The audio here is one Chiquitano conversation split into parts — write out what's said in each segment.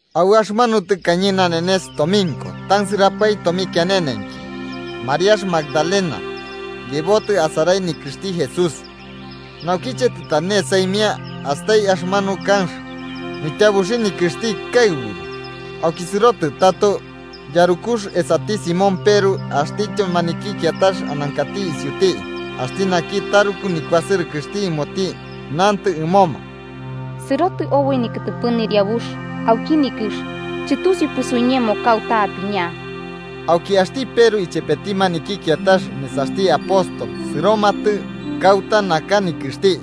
Au axɨmanu tɨkañe nanenes tominko tansɨrapae tomikianenenki, Mariax Magdalena yebotɨ asarai nikɨxti Jesús. Naukiche tɨtane saimia astai axɨmanu kanx nityabuxi nikɨxti kaɨburu. Auki sɨrotɨ tato yarukux esati Simón Peru axtityo maniki kiatax anankati isiuti axti naki taruku nikuasɨrɨkɨxti ɨmoti, nantɨ ɨmoma: –¡Sɨrotɨ oboi nikɨtɨpɨ Nɨriabux auki nikɨx, chɨtusiupɨ suiñemo kauta apiña! Auki axti Peru ichepeti maniki kiatax nesaxti apótol sɨromatɨ kauta naka nikɨxti.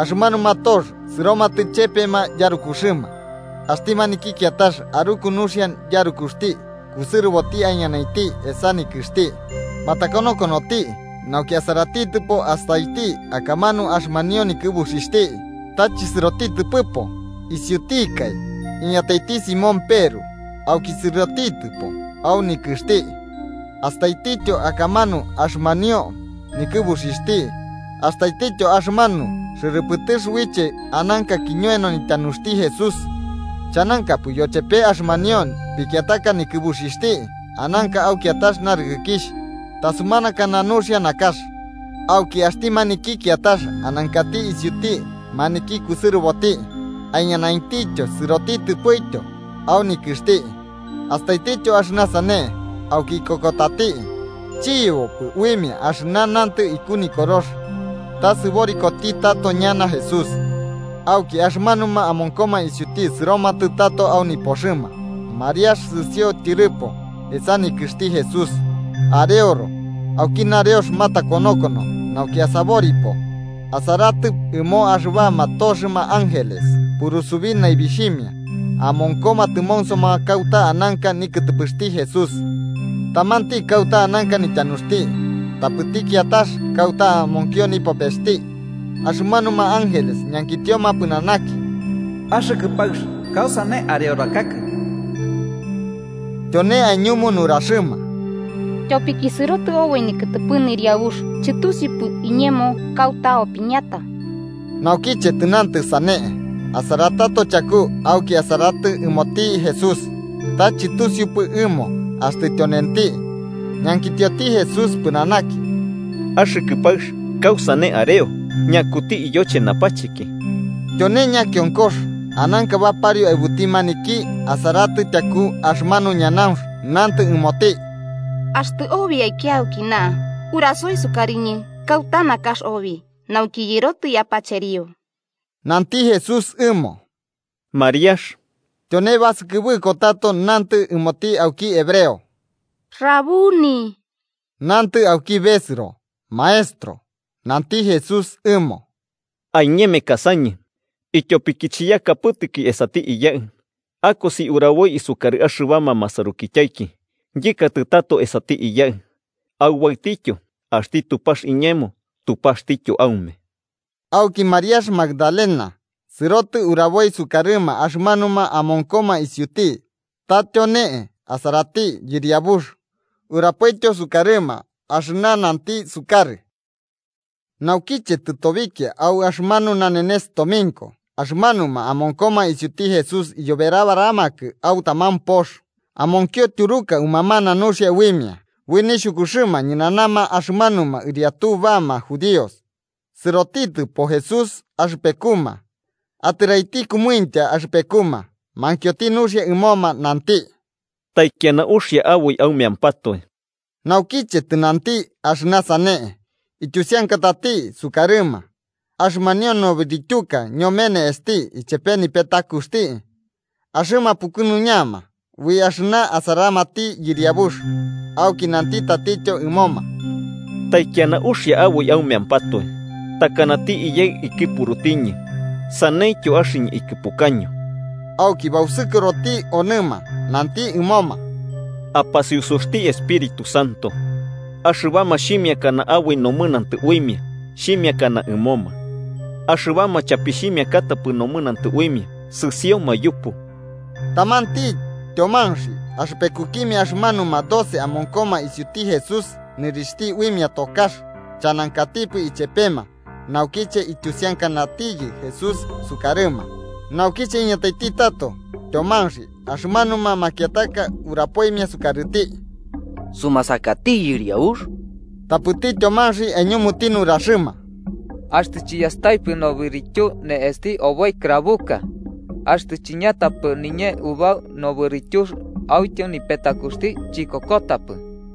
Axɨmanuma tox sɨromatɨ chepema yarukuxɨma. Axti maniki kiatax aruku nuxia yarukuxti kusɨrɨboti aiñanainti esa nikɨxti. Matakonokonoti nauki asaratitɨpo, astaiti akamanu axɨmanio nikɨbuxixhti, ta chisɨrotitɨpɨpo. Isiutikai iñataiti Simón Peru, auki sɨrotitɨpo au nikɨxti. Astaitityo akamanu axɨmanio nikɨbuxixhti. Astaitityo axɨmanu xɨrɨpɨtɨx uiche ananka kiñoeno nityanuxti Jesús chanankapɨ yochepe axɨmanio pikiataka nikɨbuxixhti, ananka au kiatax narɨkɨkixh tasumanakana nuxia nakax. Auki axti maniki kiatax anankati isiuti maniki kusɨrɨboti aiñanainti sɨrotitɨpoityo au nikɨxti. Astaitityo axɨna sane, auki ikokotati. Chiyebopɨ uimia axɨna nantɨ iku Nikorox, ta sɨborikoti tato ñana Jesús. Auki, axɨmanuma amonkoma isiuti sɨromatɨ tato au nipoxɨma. Mariax sɨsio tyɨrɨpo, esa nikɨxti Jesús, areoro. Auki nareox, matakonokono nauki asaboripo, asaratɨ ɨmo axɨbama toxɨma ángeles purusubí naibixhimia, amonkoma tɨmonsoma kauta ananka nikɨtɨpɨxti Jesús. Tamanti kauta ananka nityanuxti tapɨti kiatax kauta amonkio nipopesti. Axɨmanuma ángeles ñankitioma pɨnanaki: –Axɨkɨ paɨx, ¿kausane areorakakɨ? Tyone aiñumu nuraxɨma: –Tyopiki sɨrotɨ oboi nikɨtɨpɨ Nɨriabux iñemo, chɨtusiupɨ iñemo kauta opiñata. Naukiche tɨnantɨ sane, asaratato chaku auki asaratɨ ɨmoti Jesús, ta chɨtusiupɨ ɨmo axtɨ tyonenti. Ñankitioti Jesús pɨnanaki: –Axɨkɨ paɨx, ¿kausane areo? ¿Ñakuti iyoche napacheki? Tyone ñakionkox ananka bapario aɨbuti maniki asaratitɨ tyaku axɨmanu ñanaunx, nantɨ ɨmoti: –Axtɨ obi aikia aukina, urasoi sukarɨñɨ kauta nakax obi, nauki yɨrotɨ yapacherio. Nanti Jesús ɨmo: –¡Mariax! Tyone basɨkɨbɨko tato nantɨ ɨmoti auki hebreo: –¡Rabuni! (nantɨ auki besɨro: “Maestro”). Nanti Jesús ɨmo: –Aiñemekasañɨ, ityopiki chiyakapɨtɨki esati Iyaɨ. Akosi uraboi sukarɨ axɨbama masarukityaiki yɨkatɨ tato esati Iyaɨ, aubaɨtityo, axti Tupax iñemo Tupaxtityo aume. Auki Mariax Magdalena sɨrotɨ uraboi sukarɨma axɨmanuma amonkoma isiuti ta tyone asarati Yɨriabux, urapoityo sukarɨma axɨna nanti sukarɨ. Naukiche tɨtobikia au axɨmanu nanenes tominko, axɨmanuma amonkoma isiuti Jesús iyoberabaramakɨ au taman pox. Amonkio tyuruka umamana nuxia uimia ui nixhukuxɨma ñɨnanama axɨmanuma ɨriatuma axɨmanuma judíos. Sɨrotitɨpo Jesús axɨpekuma, atɨraiti kɨmuintya axɨpekuma, mankioti nuxia ɨmoma, nanti: –¡Taikiana uxia aboi aumeampatoe! Naukiche tɨnanti axɨna sane, ityusiankatati sukarɨma axɨmanio nobɨrityuka ñome ne'esti ichepe nipetakuxti. Axɨma pukɨnuñama ui axɨna asaramati Yɨriabux. Auki nanti tatityo ɨmoma: –¡Taikiana uxia aboi aumeampatoe! Takanati Iyaɨ ikɨpurutiñɨ, saneityo axɨñɨ ikɨpukaño. Auki bausukɨroti onɨma, nanti ɨmoma: –Apasusiusuxti Espíritu Santo. Axɨbama xhimiakana aboi nomɨnantɨ uimia, xhimiakana ɨmoma. Axɨbama chapixhimiakatapɨ nomɨnantɨ uimia, sɨsioma yupu. Tamanti Tyomanxi axɨpekukimia axɨmanuma doce amonkoma isiuti Jesús, nɨrixhti uimia Tokax, chanankatipɨ ichepema naukiche ityusiankanatiyɨ Jesús sukarɨma. Naukiche iñataiti tato Tyomanxi, axɨmanuma makiataka urapoimia sukarɨti: –Sumasakati Yɨriabux. Tapɨti Tyomanxi aiñumuti nuraxɨma: –Axtɨ chiyastaipɨ nobɨrityu ne'esti oboi krabuka, axtɨ chiñatapɨ niñee ubau nobɨrityux autyo nipetakuxti, chikokotapɨ.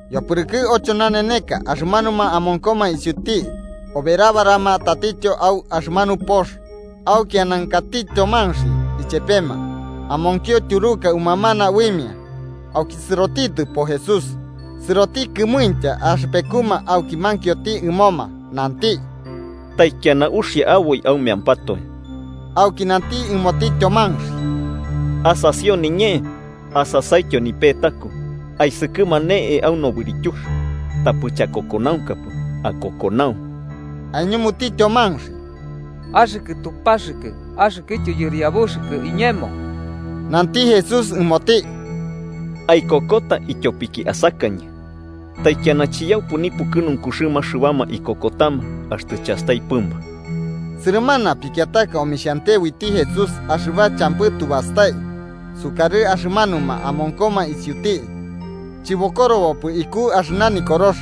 Yopɨrɨkɨ ocho naneneka, axɨmanuma amonkoma isiuti oberabarama tatityo au axɨmanu pox, auki anankati Tyomanxi ichepema. Amonkio tyuruka umamana uimia, auki sɨrotitɨpo Jesús, sɨroti kɨmuintya axɨpekuma auki mankioti ɨmoma, nanti: –¡Taikiana uxia aboi aumeampatoe! Auki nanti ɨmoti Tyomanxi: –Asasio niñee asasaityo nipetaku, aisɨkɨma ne'e au nobɨrityux. Tapɨ chakokonaunkapɨ. ¡Akokonau! Aiñumuti Tyomanxi: –¡Axɨkɨ Tupaxɨkɨ axɨkɨtyo Yɨriabuxɨkɨ iñemo! Nanti Jesús ɨmoti: –Aikokota ityopiki asakañɨ. ¡Taikiana chiyaupɨ nipukɨnunkuxɨma axɨbama ikokotama axtɨ chastaipɨma! Sɨrɨmana pikiataka omixhante uiti Jesús axɨba champɨ tu bastai, sukarɨ axɨmanuma amonkoma isiuti, chɨbokorobopɨ iku axɨna Nikorox.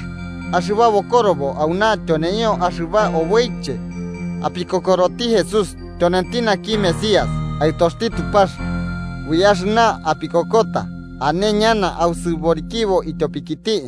Axɨba bokorobo auna tyoneio axɨba oboiche apikokoroti Jesús tyonenti naki Mesías, Aɨtoxti Tupax, ui axɨna apikokota ane ñana ausɨborikibo ityopikiti.